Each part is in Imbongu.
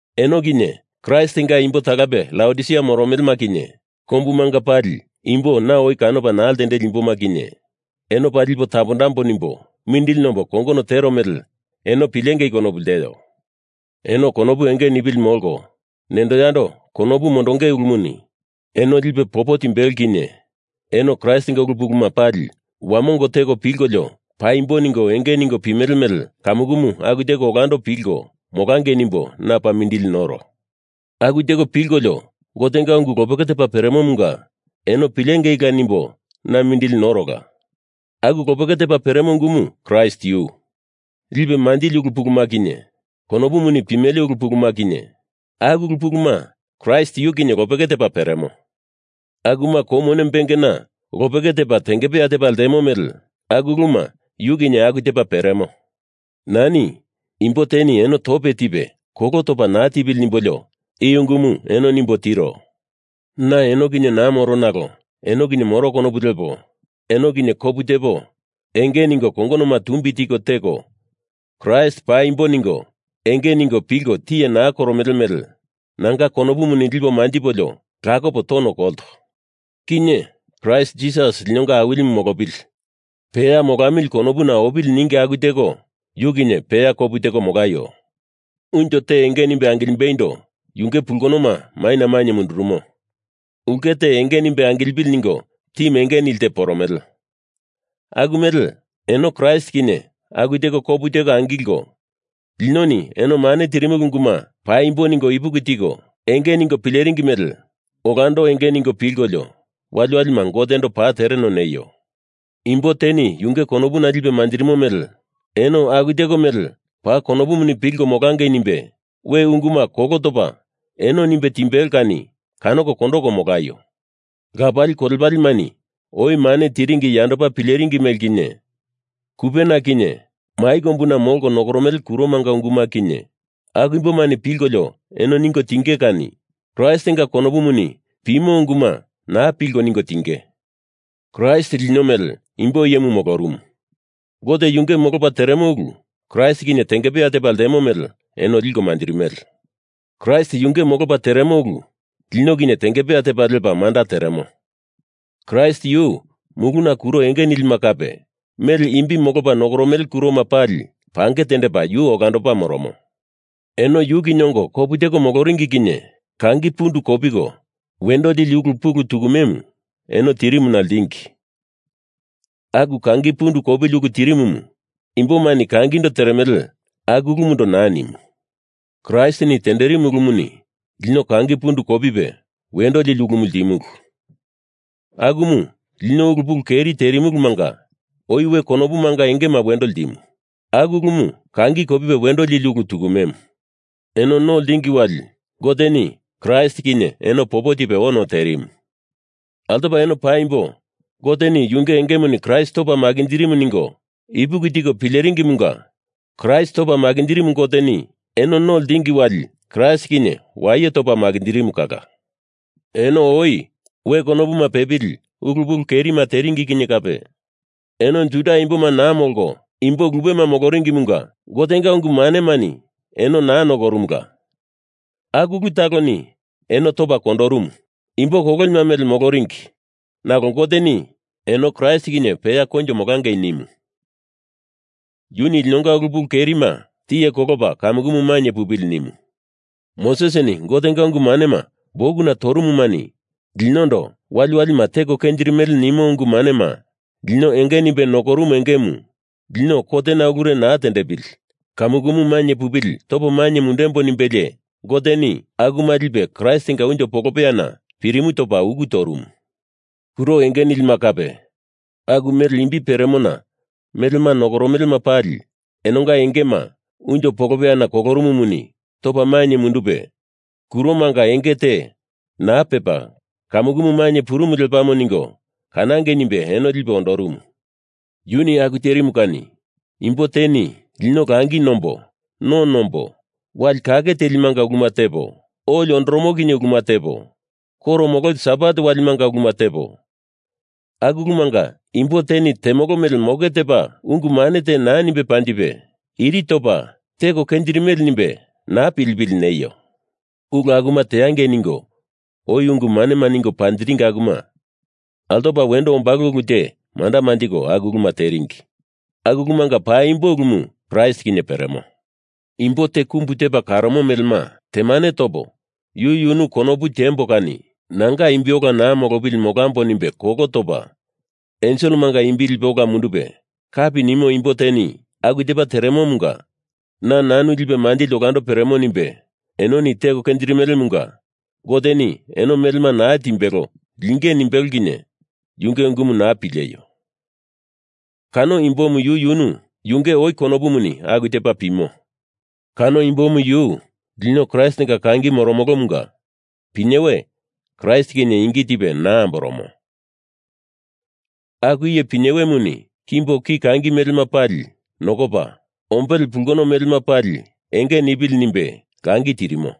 Eno kinye, Kraistinga imbo talape Laodisia moromelema kinye, kombumanga pali imbo na oi kanopa naa ltendeli imboma kinye, eno paa lipo tapondambo nimbo mindili nombo kongono tero mele eno pilengei konopu lteo. Eno konopu enge nipili molko, nendo yando konopu mondonge ulumuni eno lipe popo timbelo kinye eno Kraistinga ulu puluma pali wamongo teko pilkolio paimbo ningo enge ningo pimele mele kamukumu aku teko olando pilko molangei nimbo na paa mindili noro. Aku teko pilkolio Gotenga ungu lopeke tepa peremomunga eno pilengeila nimbo na mindili norola. Aku lopeke tepa peremo ungumu Kraist yu. Lipe manjili ulu puluma kinye, konopuni pimele ulu puluma kinye, aku ulu puluma Kraist yu kinye lopeke tepa peremo. Akuma kou mone bengena lopeke tepa tengepeya tepa ltemo mele aku uluma yu kinye aku tepa peremo. Nani imbo teni eno tope tipe kolo topa naa tipili nimbolio i ungumu eno nimbo tiro. Na eno kinye naa moro nalo eno kinye moro konopu lepo, eno kinye kopu tepo enge ningo kongonoma tumbi tiko teko Kraist paimbo ningo enge ningo pilko tiye naa koromele mele nanga konopumuni lipo manjipolio lakopo tono kolto. Kinye, Kraist Jisas linonga Awilimu molopili, peya molamili konopuna opili ningi aku teko yu kinye peya kopu teko molaio. Unjo te enge nimbe angilimbeindo yunge pulkonoma maina mainye mundurumo, ulke te enge nimbe angilipili ningo timu enge nili te poromele aku mele eno Kraist kinye aku teko kopu teko angilko, linoni eno mane tirimulu unguma paimbo ningo ipuki tiko enge ningo pileringi mele olando enge ningo pilkolio, waliwalima Gotendo paa tereno neio. Imbo teni yunge konopuna lipe manjirimo mele eno aku teko mele paa konopuni pilko molangei nimbe we unguma kolo topa eno nimbe timbelo kani kanoko kondoko molaio. Lapali kolepalemani oi mane tiringi yandopa pileringi mele kinye, kupena kinye mai kombuna molko nokoromele kuromanga unguma kinye, aku imbomani pilkolio eno ningo tinge kani. Kraistinga konopuni pimo unguma naa pilko ningo tinge. Kraist lino mele imbo iyemu molorumu. Gote yunge molopa teremo ulu Kraist kinye tengepeya tepa ltemo mele eno liko manjirimele. Kraistini yunge molopa teremo ulu lino kinye tengepeya tepa lepa manda tenderemo. Kraist yu muluna kuro enge nilima kape aku mele imbi molopa nokoromele kuroma pali pange tendepa yu olandopa moromo. Eno yu kinye ongo kopu teko moloringi kinye kangi pundu kopiko wendo lili ulu pulu tukumemu eno tirimuna ltingi. Aku kangi pundu kopili ulu tirimumu imbomani kangindo teremele aku ulumundo naa nimu. Kraistini tenderimu ulumuni lino kangi pundu kopipe wendo lili ulumu ltimulu, akumu lino ulu pulu keri terimulumanga oi we konopumanga engema wendo ltimu. Aku ulumu kangi kopipe wendo lili ulu tukumemu. Eno no ltingi wali Goteni Kraist kinye eno popo tipe ono terimu. Altopa eno paimbo Goteni yunge engemuni Kraist topa makinjirimu ningo ipuki tiko pileringimunga Kraist topa makinjirimu Goteni eno no ltingi wali Kraist kinye waye topa makinjirimu kala. Eno oi we konopuma pepili ulu pulu kerima teringi kinye kape, eno Juda imboma naa molko imbo lupema moloringimunga Gotenga ungu manemani eno naa nokorumula, aku ulu taloni eno topa kondorumu, imbo kololima mele moloringi, nalo Goteni eno Kraist kinye peya koinjo molangei nimu. Yuni linonga ulu pulu kerima tiye kolopa kamukumu mainye pupili nimu. Mosesini Gotenga ungu manema bukuna torumumani linondo wali walima teko kenjirimele nimo ungu manema lino enge nimbe nokorumu engemu lino kotena ulure naa tendepili kamukumu mainye pupili topo mainye mundembo nimbelie Goteni akuma lipe Kraistinga unjo polopeyana pirimu topa uku torumu. Kuro enge nilima kape, aku mele imbi peremona melema nokoromelema pali enonga engema unjo polopeyana kolorumumunga topa mainye mundupe, kuromanga enge te naa pepa kamukumu mainye purumu lepamo ningo kanangei nimbe eno lipe ondorumu. Yuni aku terimu kani imbo teni lino langi nombo no nombo wali kake telimanga uluma tepo, oli ondoromo kinye uluma tepo, koro mololi Sabat walimanga uluma tepo, aku ulumanga imbo teni temolo mele moke tepa ungu mane te naa nimbe panjipe, iri topa teko kenjirimele nimbe naa nipili neio. Ulu akuma teangei ningo oi ungu manema ningo panjiringi akuma altopa wendo ombalo ulu te manda manjiko aku uluma teringi. Aku ulumanga paimbo ulumu Kraist kinye peremo. Imbo te kumbu tepa kanoromo melema temane topa yu yunu konopu tiembo kani nanga imbi ola naa molopili molambo nimbe kolo topa, enselemanga imbi lipe ola mundupe kapi nimo imbo teni aku tepo teromunga na nanu lipe manjili olando peremo nimbe enoni teko kenjirimelemunga Goteni eno melema naa timbelo linge nimbelo kinye yunge ungumu naa pileio! Kano imbomu yu yunu yunge oi konopumuni aku tepa pimo. Kano imbomu yu lino Kraistinga kangi moromolomunga pinyewe Kraist kinye ingi tipe naa amboromo. Aku iye pinyewemuni kimbo ki kangi melemanga pali nokopa, ombele pulkono melema pali enge nipili nimbe langi tirimo.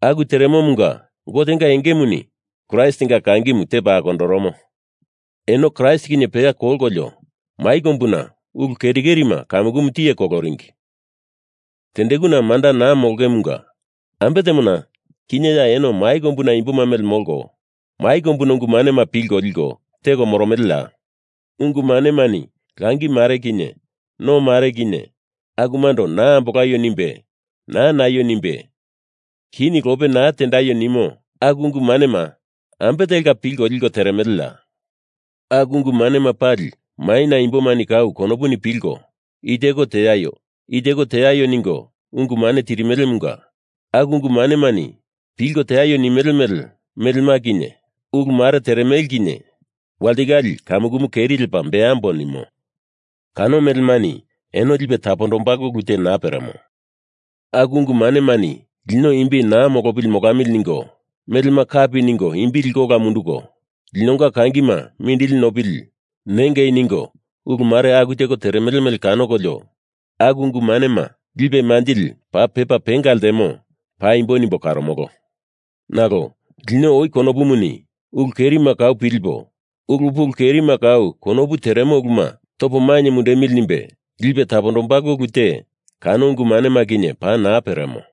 Aku teremomunga Gotenga engemuni Kraistinga kangimu tepa akondoromo. Eno Kraist kinye peya kolkolio mai kombuna ulu keri kerima kamukumu tiye koloringi tendekuna manda naa molongemunga ambe temona kinye eno ya mai kombuna imboma mele molko mai kombuna ungu manema pilko liko teko moromeleya? Ungu manemani langi mare kinye no mare kinye akumando naa ambolaio nimbe, naa naio nimbe, kini lope naa tendaio nimo aku ungu manema ambe telka pilko liko teremeleya? Aku ungu manema pali maina imbomani kau konopuni pilko i teko teaio, i teko teaio ningo ungu mane tirimelemunga aku ungu manemani pilko teaio nimele melema kinye ulu mare teremele kinye walitikale kamukumu keri lepa beambo nimo. Kano melemani eno lipe tapondombalo ulu te naa peremo. Aku ungu manemani lino imbi naa molopili molamili ningo, melema kapi ningo imbi liko ola munduko, linonga kangima mindili nopili nengei ningo ulu mare aku teko teremele mele kanokolio aku ungu manema lipe manjili paa pepa penga ltemo paimbo nimbo karomolo. Nalo lino oi konopumuni ulu kerima kau pilipo ulu pulu kerima kau konopu teremo uluma topo mainye mundemili nimbe lipe tapondombalo ulu te kano ungu manema kinye paa naa peremo.